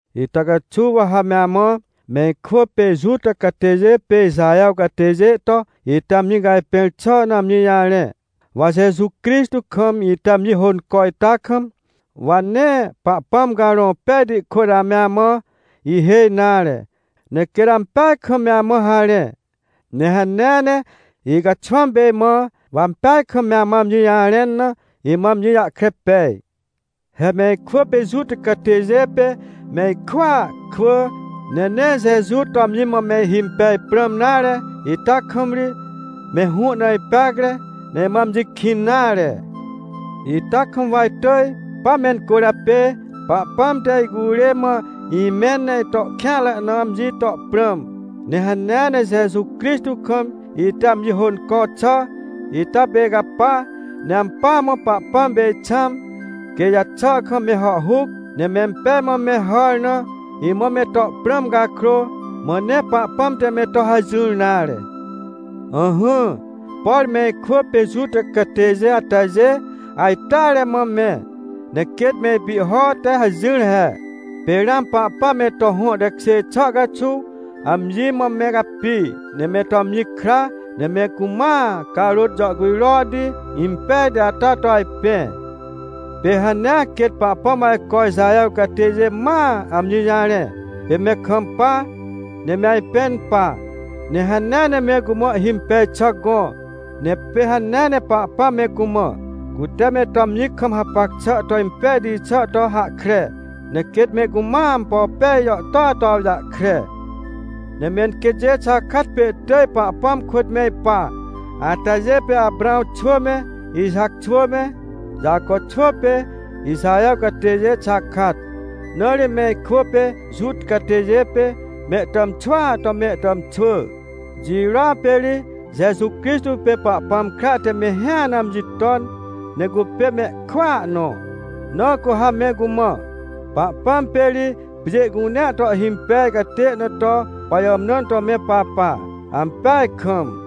Ita caxuw wa ha me amã, me ikwỳ pê Juta catêjê pê Ixaher catêjê to, ite amji cajpẽr xà na amji jarẽ. Wa Jeju Crixtô kam ite amji hônco ita kam, wa nee Pahpãm Carõ Pejti kôt ame amã ihêj nare, ne quêt ampeaj kam me amã harẽ. Ne hanea ne icaxwãm pê imã, wa ampeaj kam ame amã amji jarẽn na, imã amji jahkre pej. He me ikwỳ pê Juta catêjê pê me ikwỳa kwỳ, ne nee Jeju to amji mã mehhimpej prãm nare ita kam ri, me hũ na ipeacre, ne imã amji kĩn nare. Ita kam wa itỳj, pa mencwỳrjapê Pahpãm te icurê mã imẽn ne ito kêanre na, amji to prãm. Ne hanea ne Jeju Crixtô kam ite amji hônco xà ita pê icapa, ne ampỳa mã Pahpãm pê ixãm, quê ijaxà kam me hàhhuc, ne mempej mã me hàr na, imã me to prãm cakrô, mã nee Pahpãm te me to hajỹr nare. Ỹhỹ, por me ikwỳ pê Juta catêjê atajê ajteare mã me, ne quêt me ipihho te hajỹr he. Pê ramã Pahpãm me to hõ tekjê xà caxuw amji mã me capi, ne me to amji kra, ne me cumãa Carôt jàhcujrohti impejti ata to ajpẽ. Pê hanea quêt Pahpãm ajco Ixaher catêjê mãa amji jarẽ, pê me kampa, ne me ajpẽn pa, ne hanea ne me cumã ihhimpej xà gõ. Ne pê hanea ne Pahpãm me cumã, cute me to amji kam hapac xà to impejti xà to hahkre, ne quêt me cumãa ampo pej jàhtôa to awjahkre. Ne menquêtjê xakat pê ihtỳj Pahpãm kôt me ipa, atajê pê Aprãw xwỳ me, Ixac xwỳ me, Jaco xwỳ pê Ixaher catêjê xakat. Na ri me ikwỳ pê Juta catêjê pê mehtàmxwỳa to mehtàmxwỳ. Jirôa pê ri Jeju Crixtô pê Pahpãm kra te mehĩa na amji ton, ne cupê mehkwỳa nõ. Na cu ha me cumã, Pahpãm pê ri pjê cunea to ihhimpej catê na to pajàmnãn to me papa. Ampeaj kam!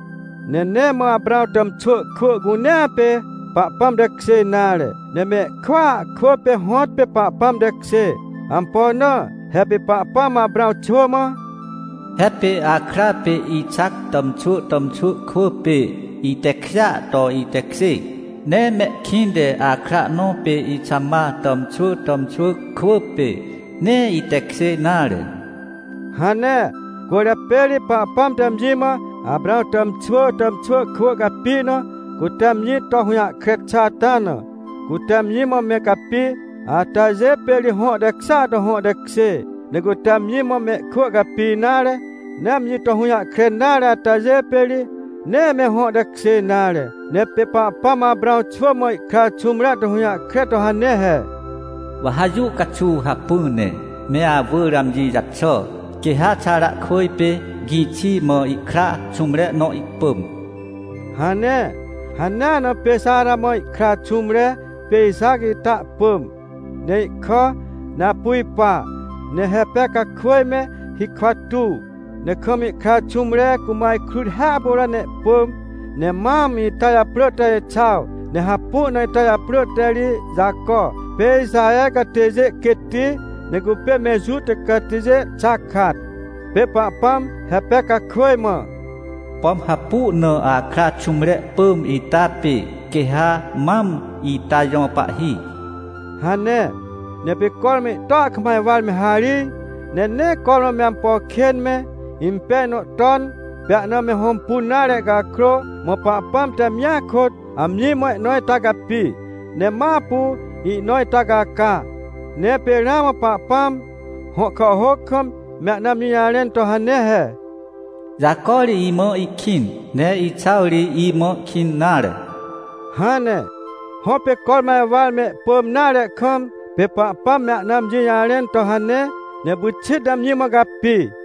Ne nee mã Aprãw tàmxwỳ kwỳ cunea pê Pahpãm tekjê nare. Ne mehkwỳa kwỳ pê hõtpê Pahpãm tekjê. Ampo na? He pê Pahpãm Aprãw xwỳ mã: “He pê akra pê Ixac tàmxwỳ tàmxwỳ kwỳ pê itekjêa to itekjê. Ne mehkĩnte akra nõ pê Ixamar tàmxwỳ tàmxwỳ kwỳ pê, nee itekjê nare” hane. Cwỳrjapê ri Pahpãm te amji mã Aprãw tàmxwỳ tàmxwỳ kwỳ capi na, cute amji to hũjahkre xà ata na. Cute amji mã me capi atajê pê ri hõ tekjêa to hõ tekjê. Ne cute amji mã mehkwỳ capi nare, ne amji to hũjahkre nare atajê pê ri, nee me hõ tekjê nare. Ne pê Pahpãm Aprãw xwỳ mã ihkra xũmre to hũjahkre to hane he: “Wa ha jũ caxuw hacpỹ ne me awỳr amji jaxà, quê ha Xarakwỳj pê gĩxi mã ihkra xũmre nõ ihpỳm” hane. Hanea na pê Xara mã ihkra xũmre pê Ixac ita ihpỳm, ne ihkà. Ne apu ipa, ne Repecakwỳj me hikwa tuw, ne kam ihkra xũmre cumã ajkrut hiahpuro ne ihpỳm. Ne mam ita japrỳ te Exaw, ne hapu na ita japrỳ te ri Jaco pê Ixaher catêjê quêtti, ne cupê me Juta catêjê xakat. Pê Pahpãm Repecakwỳj mã: “Pom hapu na akra xũmre pỳm ita pê quê ha mam ita jõ pahhi” hane. Ne pê cormã ihtua kam ajwar me harij, ne nee cormã me ampo kên me, impej nõ ton, pê ahna me hõmpun nare cakrô, mã Pahpãm te amjia kôt, amji mã ihnõ ita capi, ne ma apu ihnõ ita caca. Ne pê ramã Pahpãm, hõ kàhhôc kam, me ahna amji jarẽn to hane he: “Jaco ri imã ihkĩn, ne Exaw ri imã kĩn nare” hane. Hõ, pê cormã ajwar mehpỳm nare kam, pê Pahpãm me ahna amji jarẽn to hane, ne pyxit ne amji mã capi.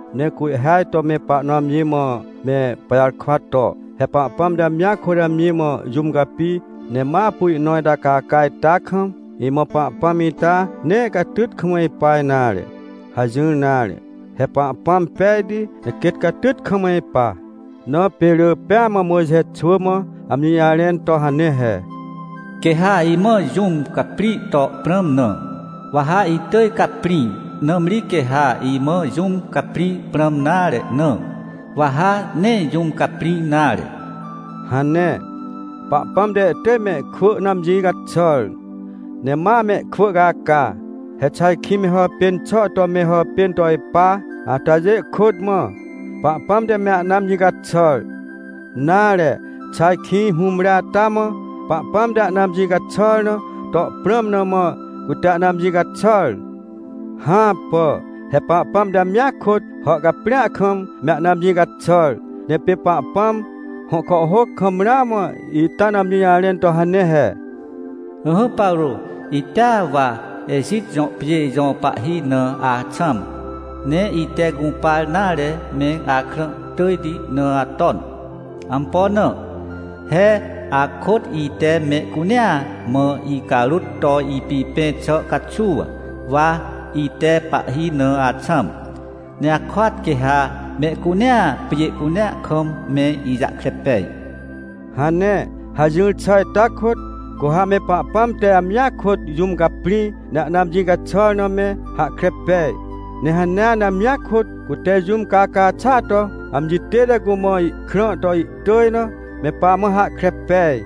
Ne cu ihhêaj to me pahnõ amji mã me pajarkwa to: — He Pahpãm te amjia kôt amji mã jũm capi, ne ma apu ihnõ ita caca ita kam, imã Pahpãm ita nee catyt kam ipa nare — hajỹr nare. He Pahpãm pejti, ne quêt catyt kam ipa. Na pê rỳ pêa mã Mojxe xwỳ mã amji jarẽn to hane he: “Quê ha imã jũm caprĩ to prãm na, wa ha itỳj caprĩ. Nãmri quê ha imã jũm caprĩ prãm nare na, wa ha nee jũm caprĩ nare” hane. Pahpãm te ihtỳj mehkwỳ na amji caxàr, ne ma amehkwỳ caca. He xà ajkĩ me hàpên xà to me hàpên to ipa atajê kôt mã, Pahpãm te me ahna amji caxàr? Nare, xà ajkĩ hũmre ata mã, Pahpãm te ahna amji caxàr na to prãm na mã, cute ahna amji caxàr? Hãpà! He Pahpãm te amjia kôt, hàhcaprĩa kam, me ahna amji caxàr. Ne pê Pahpãm, hõ kàhhôc kam ramã ita na amji jarẽn to hane he: “Ỹhỹ Paro, itea wa Ejit jõ pjê jõ pahhi na axãm. Ne ite gũpar nare me, akrã tỳjti na aton. Ampo na? He akôt ite mehcunea mã icarôt to ipipẽ xà caxuw, wa ite pahhi na axãm. Ne akôat quê ha mehcunea, pjê cunea kam me ijahkre pej” hane. Hajỹr xà ita kôt, cu ha me Pahpãm te amjia kôt jũm caprĩ, ne ahna amji caxàr na me hahkre pej. Ne hanea ne amjia kôt, cute jũm caca xàa to amji tête cumã ihkrã to ihtỳj na, me pamã hahkre pej.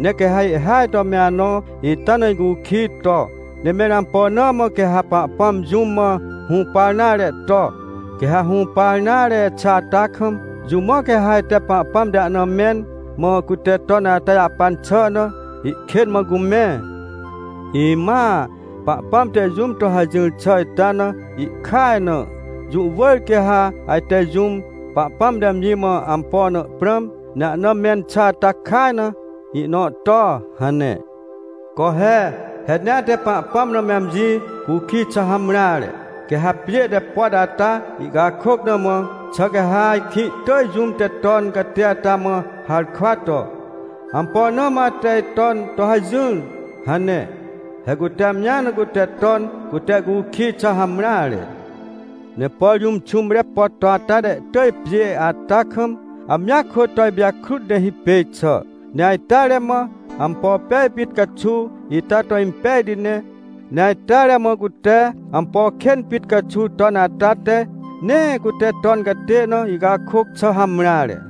Ne ca ihhêaj to me anõ ita na icukij to: — Ne mẽr ampo na mã quê ha Pahpãm jũm mã hũpar nare to, quê ha hũpar nare xà ata kam, jũ mã quê ha ajte Pahpãm te ahna mẽn, mã cute ton ata jahpan xà na, ihkên mã cumẽ? Imãa Pahpãm te jũm to hajỹr xà ita na ihkaj na. Jũ wỳr quê ha ajte jũm, Pahpãm te amji mã ampo na prãm, ne ahna mẽn xà ata kaj na ihnõ to — hane. Co he! He nee ate Pahpãm na me amji cukij xà hamreare! Quê ha pjê te pot ata ihcakôc na mã, xà quê ha ajkĩ ihtỳj jũm te ton catê ata mã harkwa to: — Ampo na mã ate iton to hajỹr? — hane. He cute amji na cute ton catê cukij xà hamreare. Ne por jũm xũmre pot to ata te ihtỳj pjê ata kam, amjia kôt to ipijakrut ne hipêj xà. Ne ajteare mã ampo pej pit caxuw, ita to impejti ne. Ne ajteare mã cute ampo kên pit caxuw ton ata te, nee cute ton catê na, ihcakôc xà hamreare.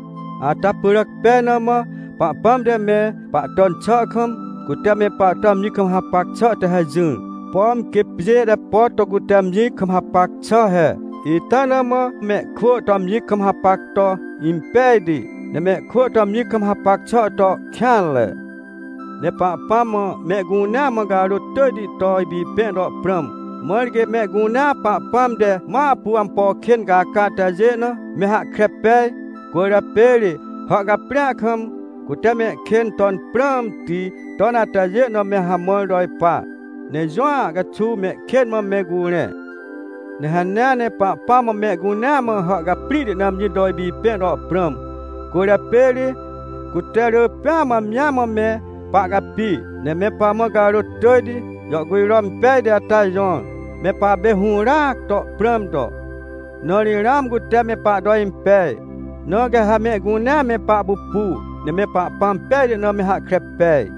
Ata pyràc pej na mã, Pahpãm te me pahton xà kam, cute me pahto amji kam hapac xà te hajỹar, pom quê pjê te pot to cute amji kam hapac xà he. Ita na mã mehkwỳ to amji kam hapac to impejti, ne mehkwỳ to amji kam hapac xà to kêanre. Ne Pahpãm mã mehcunea mã carôt tỳjti to ipipẽ to prãm, mãr quê mehcunea Pahpãm te ma apu ampo kên caca atajê na, me hahkre pej. Cwỳrjapê ri hàhcaprĩa kam, cute mehkên ton prãmti ton atajê na me hamãr to ipa, ne jũa caxuw mehkên mã me curẽ. Ne hanea ne Pahpãm mã mehcunea mã hàhcaprĩhti na amji to ipipẽ to prãm. Cwỳrjapê ri cute rỳ pêa mã amji mã me pahcapi, ne me pamã carôt tỳjti jàhcujro impejti ata jõr, me papê hũràac to prãm to, na ri ramã cute me pahto impej. Na quê ha mehcunea me pahpupu, ne me Pahpãm pejti na me hahkre pej.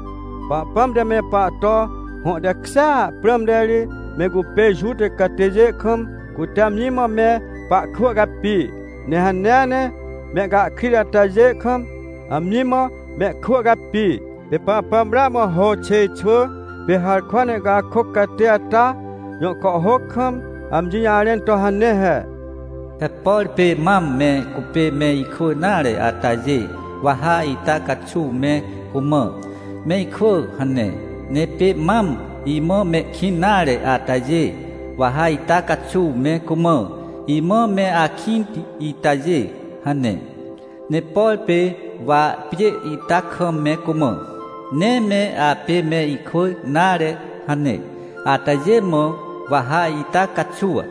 Pahpãm te me pahto hõ tekjêa prãmte ri, me cupê Juta catêjê kam cute amji mã me pahkwỳ capi, ne hanea ne mehcahkrit atajê kam, amji mã mehkwỳ capi. Pê Pahpãm ramã Hôxêj xwỳ pê harkwa na ihcakôc catê ata jõ kàhhôc kam, amji jarẽn to hane he: “He por pê mam me cupê me ikwỳ nare atajê, wa ha ita caxuw me cumã: ‘Me ikwỳ’ hane. Ne pê mam imã mehkĩn nare atajê, wa ha ita caxuw me cumã: ‘Imã me akĩnti itajê’ hane. Ne por pê wa pjê ita kam me cumã: ‘Nee me apê me ikwỳ nare’ hane, atajê mã, wa ha ita caxuw: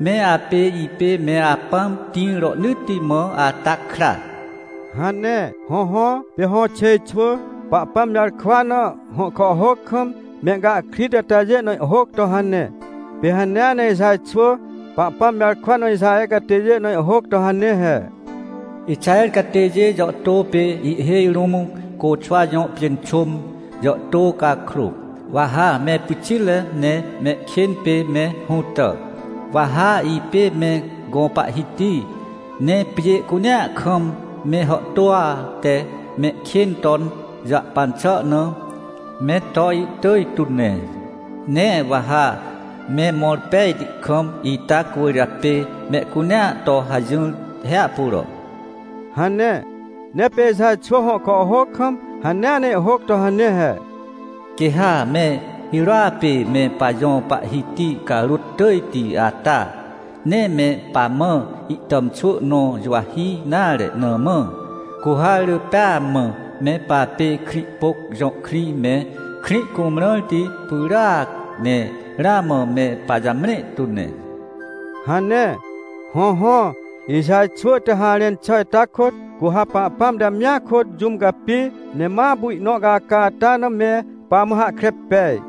‘Me apê, ipê me Apãm tĩr rohnỳtti mã ata kra’” hane. Hõhõ, pê Hôxêj xwỳ Pahpãm jarkwa na, hõ kàhhôc kam, mehcahkrit atajê na ihhôc to hane. Pê hanea ne Ixaj xwỳ Pahpãm jarkwa na Ixaher catêjê na ihhôc to hane he: “Ixaher catêjê jàhtô pê ihhêj rũm côxwa jõ pjênxôm jàhtô cakrô, wa ha me pyxitre ne mehkên pê me hũtà. Wa ha ipê me gõ Pahhiti, ne pjê cunea kam me hàhtôa te mehkên ton jahpan xà na, me to ihtỳj tu ne. Ne wa ha me mõr pejti kam, ita cwỳrjapê mehcunea to hajỹr hiahpuro” hane. Ne pê Ixaj xwỳ hõ kàhhôc kam, hanea ne ihhôc to hane he: “Quê ha me hirôa pê me pajõ Pahhiti carôt tỳjti ata, nee me pamã ihtàmxwỳ nõ juwahi nare na mã, cu ha rỳ pêa mã me papê Krĩhpôc jõ krĩ me, Krĩhcumrãrti pyràac, ne ramã me pajamre tu ne” hane. Hõhõ, Ixaj xwỳ te harẽn xà ita kôt, cu ha Pahpãm te amjia kôt jũm capi, ne ma apu ihnõ caca ata na me pamã hahkre pej.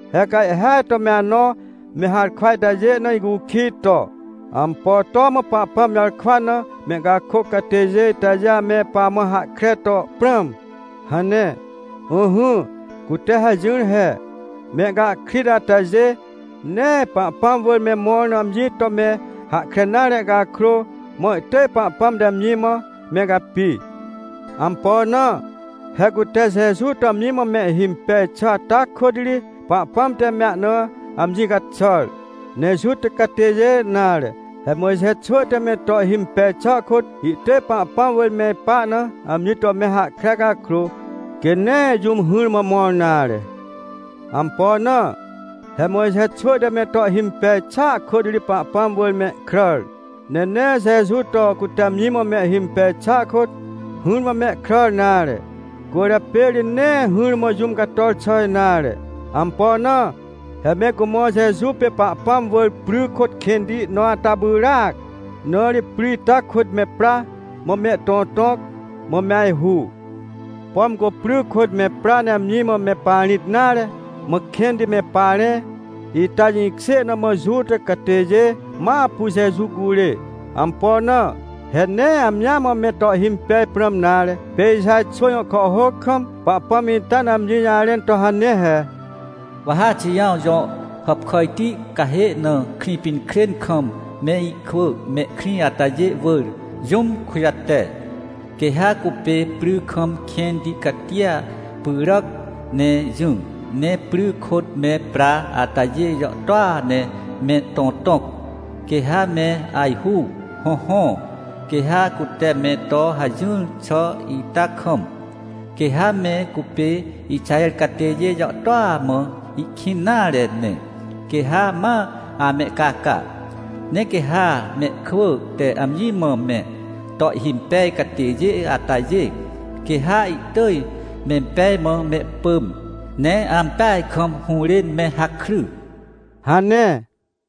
He ca ihhêaj to me anõ me harkwa itajê na icukij to: — Ampo to mã Pahpãm jarkwa na mehcakôc catêjê itajê ame pamã hahkre to prãm? — hane. Ỹhỹ, cute hajỹr he. Mehcahkrit atajê, nee Pahpãm wỳr me mõr na amji to me hahkre nare cakrô, mã ihtỳj Pahpãm te amji mã me capi. Ampo na? He cute Jeju to amji mã mehhimpej xà ata kôt ri, Pahpãm te me ahna amji caxàr. Ne Juta catêjê nare. He Mojxe xwỳ te me to ihhimpej xà kôt, ihtỳj Pahpãm wỳr me ipa na amji to me hahkre cakrô, quê nee jũm hỹrmã mõr nare. Ampo na? He Mojxe xwỳ te me to ihhimpej xàa kôt ri Pahpãm wỳr mehkràr, ne nee Jeju to cute amji mã mehhimpej xà kôt, hỹrmã mehkràr nare, cwỳrjapê ri nee hỹrmã jũm cator xà nare. Ampo na? He me cumã Jeju pê Pahpãm wỳr pry kôt kẽnti nõ ata pyràac, na ri pry ita kôt me pra, mã mehtõtõc, mã me ajhu. Pom cu pry kôt me pra ne amji mã me parĩt nare, mã kẽnti me parẽ, ita jĩkjê na mã Juta catêjê ma apu Jeju curê. Ampo na? He nee amji mã me to mehhimpej prãm nare. Pê Ixaj xwỳ jõ kàhhôc kam, Pahpãm ita na amji jarẽn to hane he: “Wa ha Xijãw jõ hàpkàjti cahê na Krĩpinkrên kam me ikwỳ mehkrĩ atajê wỳr, jũm kujate. Quê ha cupê pry kam kẽnti catia pyràc ne jỹ, ne pry kôt me pra atajê jàhtôa ne mehtõtõc, quê ha me ajhu. Hõhõ, quê ha cute me to hajỹr xà ita kam, quê ha me cupê Ixaher catêjê jàhtôa mã ihkĩn nare ne, quê ha ma amehcaca. Ne quê ha mehkwỳ te amji mã me to ihhimpej catêjê atajê, quê ha ihtỳj mempej mã mehpỳm, ne ampeaj kam hũrên me hakry” hane.